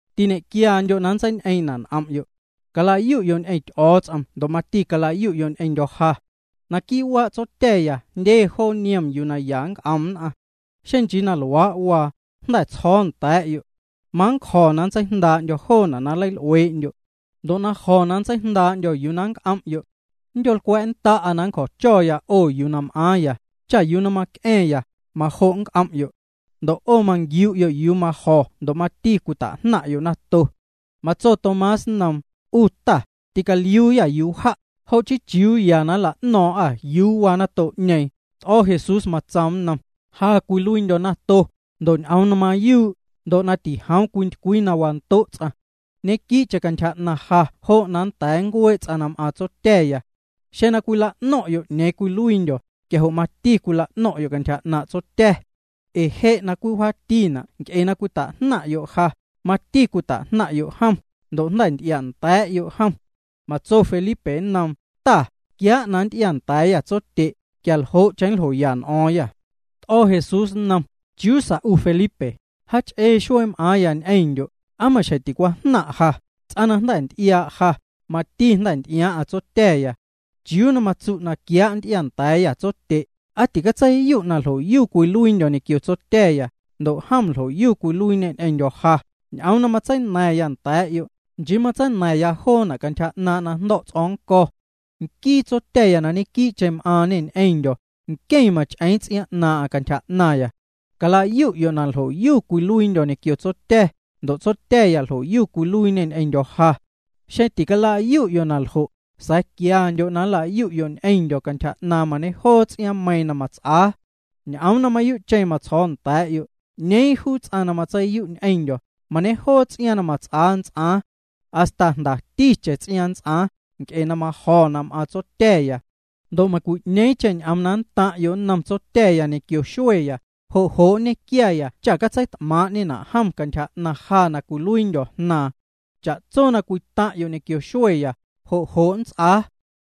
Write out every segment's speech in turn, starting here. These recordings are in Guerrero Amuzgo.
Tiñe'quiandyo' na nntseiñ'eeⁿ'ñena' n'om'yo'. Cala'yu'yo' ñ'eⁿ Ty'o̱o̱ts'om ndo' mati cala'yu'yo' ñ'eⁿndyo̱ ja. Naquii' waa' Tsotya̱ya jndye joo niom yuu na ya nnc'om nn'aⁿ. Xeⁿ nchii na luaa' waa, jnda̱ tsjo̱o̱ nda̱a̱'yo'. Manncjo̱ na nntseijndaa'ndyo̱ joona' na nleil'uee'ndyo'. Ndo' na jo̱ na nntseijndaa'ndyo̱ yuu na nnc'om'yo', nndyo̱lcwa̱'nnda'a na nncjo̱cho̱ 'o yuu na m'aaⁿya, cha yuu na mac'a̱ⁿya, majo' nnc'om'yo'. Ndo' 'o manquiu'yo' yuu na majo̱ ndo' mati cwita'jnaⁿ'yo' nato. Matso Tomás nnoom: —'U Ta, ticaliuuyâ yuu wja', jo' chii ¿chiuu ya na nla'no̱o̱ⁿ'â yuu waa nato'ñeeⁿ? T'o̱ Jesús, matsoom nnom: —Ja cwiluiindyo̱ nato, ndo' ñ'oom na mayuu', ndo' na tijoom cwintycwii na wando' ts'aⁿ. Ñequii'cheⁿ cantyja 'naⁿ ja jo' na nnda̱a̱ nncuee' ts'aⁿ na m'aaⁿ Tsotya̱ya. Xeⁿ na cwila'no̱ⁿ'yo' 'ñeeⁿ cwiluiindyo̱, quia jo' mati nla'no̱ⁿ'yo' cantyja 'naaⁿ' Tsotya̱. Na je' na cwii wjaatina' nc'e na cwita'jnaⁿ'yo' ja, mati cwita'jnaⁿ'yo' jom, ndo' jnda̱ nty'ia'nda̱a̱'yo' jom. Matso Felipe nnoom: —Ta, quiaa' na nnty'iaanda̱a̱yâ Tsotye', quialjo'cheⁿ nljoya n'o̱o̱ⁿyâ. T'o̱ Jesús nnom: —Chiuu sa 'u Felipe, jaach'ee xuee m'aaⁿya ñ'eⁿndyo', ¿aa maxjeⁿ ticwajnaⁿ' ja? Ts'aⁿ na jnda̱ nty'iaa' ja, mati jnda̱ nty'iaaⁿ'aⁿ Tsotya̱. ¿Chiuu na matsu': “Quiaa' na nnty'iaanda̱a̱yâ Tsotye'”? ¿Aa ticatseiyu' na ljo'yu cwiluiindyo̱ ñequio Tsotya̱ya, ndo' jom ljo'yu cwiluiiñê ñ'eⁿndyo̱ ja? Ñ'oom na matseina̱ⁿya nda̱a̱'yo', nchii matseina̱ⁿya joona' cantyja 'naaⁿ' na jndo̱' ts'o̱o̱ⁿ nnco̱. Nquii Tsotya̱ na ñequii'cheⁿ m'aaⁿñê ñ'eⁿndyo̱, nqueⁿ mach'eeⁿ ts'iaaⁿ 'naaⁿ'aⁿ cantyja 'naⁿya. Cala'yu'yo' na ljo'yu cwiluiindyo̱ ñequio Tsotya̱, ndo' Tsotya̱ya ljo'yu cwiluiiñê ñ'eⁿndyo̱ ja. Xeⁿ tileicala'yu'yo' na ljo', sa̱a̱ quiandyo' na nla'yu'yo' ñ'eⁿndyo̱ cantyja 'naaⁿ mañejoo ts'iaaⁿmeiiⁿ na mats'aa. Ñ'oom na mayuu'cheⁿ matsjo̱o̱ nda̱a̱'yo', 'ñeeⁿ juu ts'aⁿ na matseiyu' ñ'eⁿndyo̱, mañejoo ts'iaaⁿ na mats'aa nnts'aaⁿ. Hasta jndaticheⁿ ts'iaaⁿ nnts'aaⁿ, nc'e na majo̱ na m'aaⁿ Tsotya̱ya. Ndo' meiⁿcwi'ñeeⁿcheⁿ ñ'oom na nntaⁿ'yo' nnom Tsotya̱ ñequio xueya, jo' jo' nñequia cha na catseit'maaⁿ'ñena' jom cantyja 'naⁿ ja na cwiluiindyo̱ Jnaaⁿ. Cha'tso na cwitaⁿ'yo' ñequio xueya, jo' jo' nnts'aa.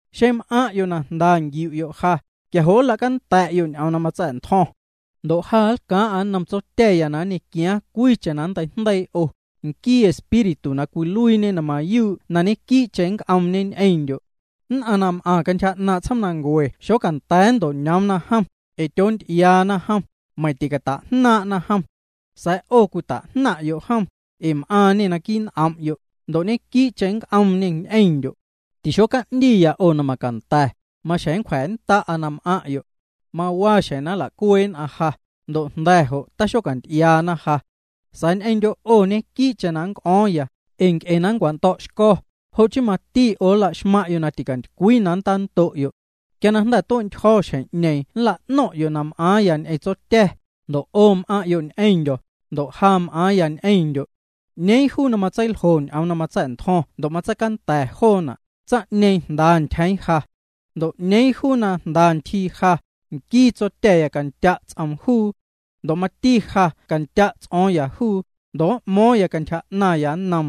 ’Xeⁿ m'aⁿ'yo' na jnda nquiu'yo' ja, quia jo' cala'canda̱'yo' ñ'oom na matsa̱'ntjo̱ⁿ. Ndo' ja nlcaaⁿ'a nnom Tsotya̱ya na nñequiaaⁿ cwiicheⁿ na nnteijndeii 'o, nquii Espíritu na cwiluiiñe na mayuu' na ñequii'cheⁿ nnc'oomñe ñ'eⁿndyo'. Nn'aⁿ na m'aⁿ cantyja 'naaⁿ' tsjoomnancue xocanda̱a̱ nnto'ñoomna jom, ee tyoonty'iaana jom, meiⁿ ticata'jnaaⁿ'na jom. Sa̱a̱ 'o cwita'jnaⁿ'yo' jom, ee m'aaⁿñê naquii' n'om'yo', ndo' ñequii'cheⁿ nnc'oomñê ñ'eⁿndyo'. Tixoca'ndiya 'o na macanda̱, maxjeⁿ nncwja̱nnda'a na m'aⁿ'yo'. Mawaa xjeⁿ na nla'cuee' nn'aⁿ ja, ndo' jnda̱ jo' taxocanty'iaana ja. Sa̱a̱ ñ'eⁿndyo' 'o ñequii'cheⁿ na nnc'o̱o̱ⁿya, ee nc'e na nncwando̱'xco̱, jo' chii mati 'o nlaxmaⁿ'yo' na ticantycwii na nntando'yo'. Quia na jnda̱ tue'ntyjo̱ xjeⁿ'ñeeⁿ nla'no̱ⁿ'yo' na m'aaⁿya ñ'eⁿ Tsotya̱, ndo' 'o m'aⁿ'yo' ñ'eⁿndyo̱, ndo' ja m'aaⁿya ñ'eⁿndyo'. 'Ñeeⁿ juu na matseiljo ñ'oom na matsa̱'ntjo̱ⁿ ndo' matseicanda̱ joona', tsaⁿ'ñeeⁿ jnda ntyjeeⁿ ja. Ndo' 'ñeeⁿ juu na jnda ntyjii ja, nquii Tsotya̱ya candya' ts'oom juu. Ndo' mati ja candya' ts'o̱o̱ⁿya juu, ndo' m'mo̱o̱ⁿya cantyja 'naⁿya nnom.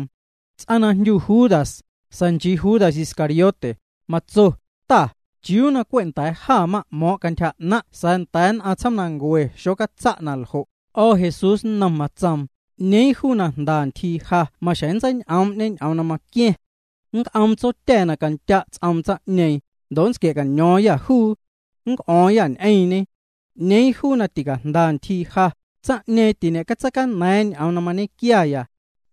Tsaⁿ na jndyu Judas, sa̱a̱ nchii Judas Iscariote, matso: —Ta, ¿chiuu na cwe' nda̱a̱ jâ m'mo̱ⁿ' cantyja 'naⁿ' sa̱a̱ nda̱a̱ nn'aⁿ tsjoomnancue xocatsa' na ljo'? T'o̱ Jesús nnom, matsoom: —'Ñeeⁿ juu na jnda ntyjii ja maxjeⁿ nntseiñ'oom'ñe ñ'oom na maqua̱ⁿ. Nnc'oom Tsotya̱ na candya' ts'oom tsaⁿ'ñeeⁿ, ndo' nntsquia̱caño̱o̱ⁿyâ juu. Nnc'o̱o̱ⁿyâ ñ'eⁿñe. 'Ñeeⁿ juu na ticajnda ntyjii ja, tsaⁿ'ñeeⁿ tiñe'catseicana̱a̱ⁿ ñ'oom na mañequiaya.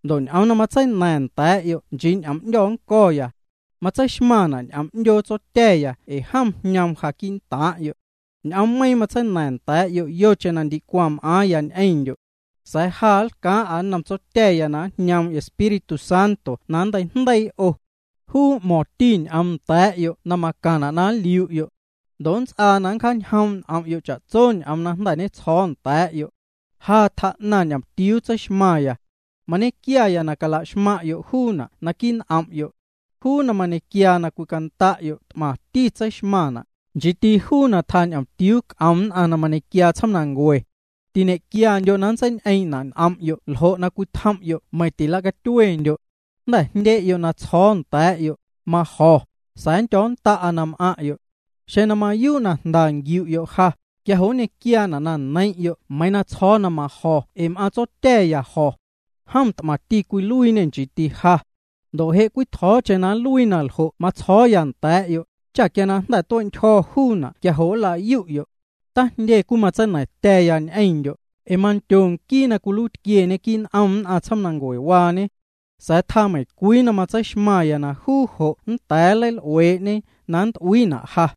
Ndo' ñ'oom na matseina̱ⁿ nda̱a̱'yo' nchii ñ'oom 'ndyo̱ nnco̱ya. Matseixmaⁿna' ñ'oom 'ndyoo Tsotya̱ya ee jom jñoom ja quii'ntaaⁿ'yo'. ’Ñ'oommeiⁿ' matseina̱ⁿ nda̱a̱'yo' yocheⁿ na ndicwaⁿ m'aaⁿndyo̱ ñ'eⁿndyo'. Sa̱a̱ ja nlcaaⁿ'a nnom Tsotya̱ya na njñoom Espíritu Santo na nnteijndeii 'o. Juu m'mo̱ⁿti ñ'oom nda̱a̱'yo' na macaⁿna' na nliu'yo'. Ndo' nnts'aa na nncjaañjoom' n'om'yo' cha'tso ñ'oom na jnda̱ ñetsjo̱o̱ nda̱a̱'yo'. ’Ja tjaa'naⁿ ñomtiuu tseixmaⁿya. Mañequiaya na cala'xmaⁿ'yo' juuna' naquii' n'om'yo'. Juu na mañequia na cwicanda'yo' t'maⁿti tseixmaⁿna', nchiiti juu na tjaa ñomtiuu c'om nn'aⁿ na mañequiaa tsjoomnancue. Tiñe'quiandyo' na nntseiñ'eeⁿ'ñena' n'om'yo' ljo' cwii nntjom'yo' meiⁿ tila'catyuendyo'. Jnda̱ jndye'yo' na tsjo̱o̱ nda̱a̱'yo', majo̱, sa̱a̱ nndyo̱nnda'a na m'aⁿ'yo'. Xeⁿ na mayuu' jnda nqiu'yo' ja, quia jo' nñequiaana' na neiⁿ'yo' meiiⁿ na tsjo̱o̱ na majo̱ ee na m'aaⁿ Tsotya̱ya jo̱. Jom t'maⁿti cwiluiiñê, nchiiti ja. Ndo' je' cwitjo̱o̱cheⁿ na nluii na ljo' matsjo̱o̱ya nda̱a̱'yo', cha quia na jnda̱ tue'ntyjo̱ juuna' quia jo' nla'yu'yo'. ’Tajndye cwimatseina̱ⁿtya̱ya ñ'eⁿndyo', ee mandyo nquii na cwiluiitquieñe quii' n'om nn'aⁿ tsjoomnancuewaañe. Sa̱a̱ tjaa meiⁿcwii na matseixmaⁿya na juu jo' nnda̱a̱ nleil'uee'ñe na cat'uiina' ja.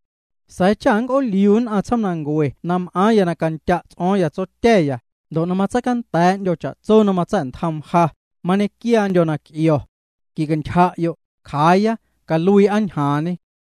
Sa̱a̱ cha nnc'ooliu nn'aⁿ tsjoomnancue na m'aaⁿya na candya' ts'o̱o̱ⁿya Tsotya̱, ndo' na matseicanda̱a̱'ndyo̱ cha'tso na matsa̱'ntjoom ja, mañequiaandyo̱ na nnc'io̱. Quicantyja'yo', cjaaya, caluii'a ñjaaⁿñe.